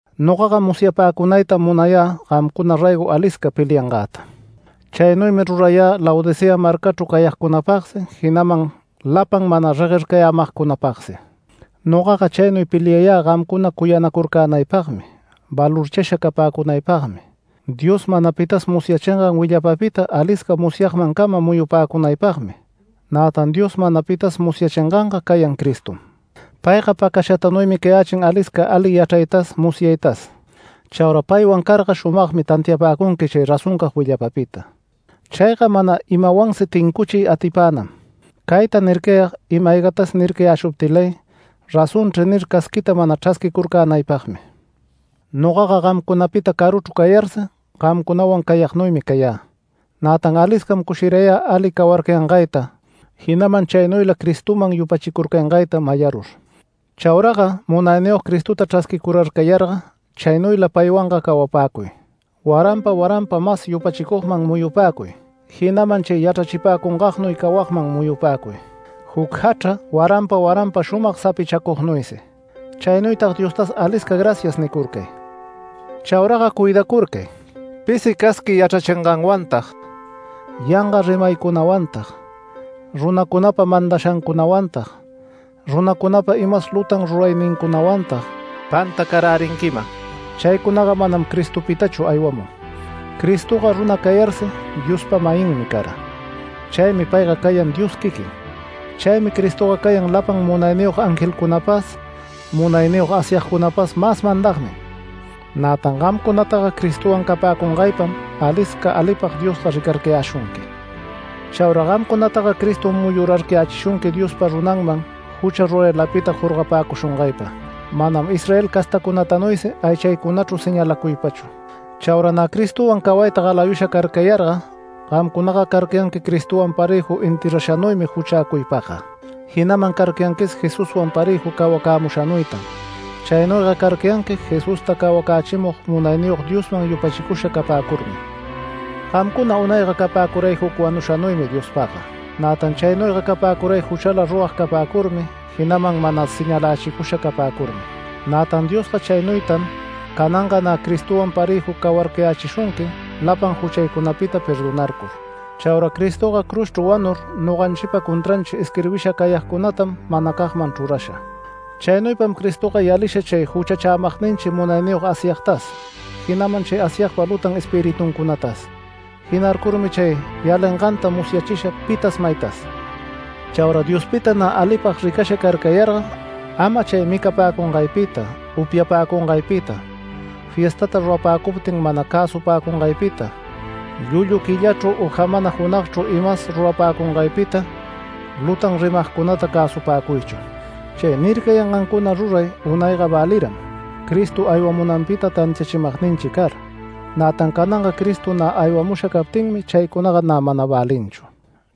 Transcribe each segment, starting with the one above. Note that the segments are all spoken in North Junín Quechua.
Nogaga musyapäcunaytam munayä gamcuna raygo alisca peliangäta. Chaynuymi rurayä Laodicea marcachru cayagcunapagsi, jinaman lapan mana reguercayämagcunapagsi. Nogaga chaynuy peliayä gamcuna cuyanacurcänaypagmi, valorchasha capäcunaypagmi, Dios mana pitas musyachingan willapapita alisca musyagmancama muyupäcunaypagmi. Nätan Dios mana pitas musyachinganga cayan Cristom. Payga pacashatanuymi cayächin alisca ali yachraytas musyaytas, chaura paywan carga shumagmi tantiapäcunqui chay razoncag willapapita. Chayga mana imawansi tincuchiy atipänam. Cayta nircayag ima-aygatas nircayäshuptilay “Razonchri” nir casquita mana chrasquicurcänaypagmi. Nogaga gamcunapita caruchru cayarsi gamcunawan cayagnuymi cayä, nätan aliscam cushirayä ali cawarcayangayta, jinaman chaynuyla Cristoman yupachicurcangayta mayarur. Chauraga Munayniyog Cristota chrasquicurarcayarga chaynuyla paywanga cawapäcuy. Waranpa waranpa mas yupachicugman muyupäcuy, jinaman chay yachrachipäcungaynuy cawagman muyupäcuy, juc jachra waranpa waranpa shumag sapichacugnuysi. Chaynuytag Diostas “Alisca gracias” nicurcay. Chauraga cuidacurcay, pisi casqui yachrachinganwantag, yanga rimaycunawantag, runacunapa mandashancunawantag, runacunapa imas lutan ruraynincunawantag pantacarärinquiman. Chaycunaga manam Cristopitachu aywamun. Cristoga runa cayarsi Diospa-mayinmi cara. Chaymi payga cayan Dios quiquin. Chaymi Cristoga cayan lapan munayniyog angelcunapas, munayniyog Asyagcunapas mas mandagnin. Nätan gamcunataga Cristowan capäcungaypam alisca alipag Diosga ricarcayäshunqui. Chaura gamcunataga Cristom muyurarcayächishunqui Diospa runanman jucha ruraylapita jorgapäcushungaypa, manam Israel castacunatanuysi aychaycunachru señalacuypachu. Chaura nä Cristowan cawayta galayusha carcayarga gamcunaga carcayanqui Cristowan parëju enterrashanuymi juchäcuypagga, jinaman carcayanquis Jesuswan parëju cawacämushanuytan. Chaynuyga carcayanqui Jesusta cawacächimug Munayniyog Diosman yupachicusha capäcurmi. Gamcuna unayga capäcuray juc wanushanuymi Diospagga. Nätan chaynuyga capäcuray juchala rurag capäcurmi, jinaman mana señalächicusha capäcurmi. Nätan Diosga chaynuytam cananga nä Cristotawan parëjuta cawarcayächishunqui, lapan juchaycunata perdonarcur. Chaura Cristoga cruzchru wanur noganchipa contranchi isquirbisha cayagcunatam manacagman chrurasha. Chaynuypam Cristoga yalisha chay juchachämagninchi munayniyog Asyagtas, jinaman chay Asyagpa lutan espirituncunatas. Jinarcurmi chay yalinganta musyachisha pitas maytas. Chaura Diospita nä alipag ricasha carcayarga, ama chay micapäcungaypita, upyapäcungaypita, fiestata rurapäcuptin mana cäsupäcungaypita, llullu quillachru, u jamana junagchru imas rurapäcungaypita, lutan rimagcunata cäsupäcuychu. Chay nircayangancuna ruray unayga väliram Cristo aywamunanpita tantiachimagninchi car, nätan cananga Cristo nä aywamusha captinmi chaycunaga nä mana välinchu.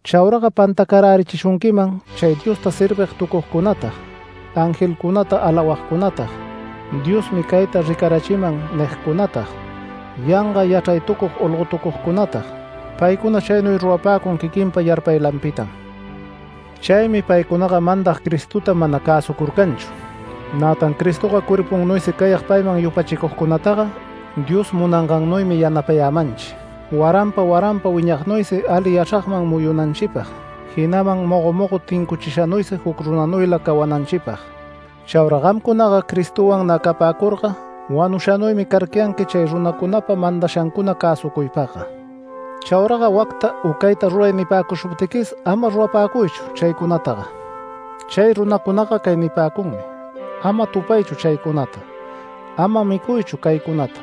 Chauraga pantacarärichishunquiman chay Diosta servigtucugcunatag, angelcunata alawagcunatag, “Diosmi cayta ricarachiman” nigcunatag, yanga yachraytucug olgotucugcunatag. Paycuna chaynuy rurapäcun quiquin yarpaylanpitam. Chaymi paycunaga mandag Cristota mana cäsucurcanchu. Nätan Cristoga cuerpunnuysi cayag payman yupachicugcunataga Dios munangannuymi yanapayämanchi, waranpa waranpa wiñachignuysi ali yachragman muyunanchipag, jinaman mogo mogo tincuchishanuysi juc runanuylata cawananchipag. Chaura gamcunaga Cristowan nä capäcurga wanushanuymi carcayanqui chay runacunapa mandashancuna cäsucuypagga. Chauraga “Wacta u cayta ruray” nipäcushuptiquis ama rurapäcuychu chaycunataga. Chay runacunaga cay nipäcunmi: “Ama tupaychu chaycunata, ama micuychu caycunata,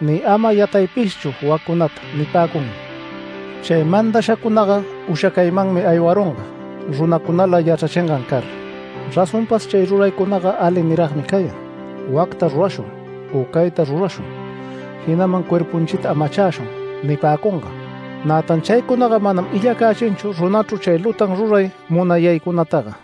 ni ama yataypischu waccunata” nipäcunmi. Chay mandashacunaga ushacaymanmi aywarunga, runacunala yachrachingan car. Razonpas chay ruraycunaga ali niragmi cayan “Wacta rurashun, u cayta rurashun” jinaman “Cuerpunchita amachäshun” nipäcungan. Nätan chaycunaga manam illacächinchu runachru chay lutan ruray munayaycunataga.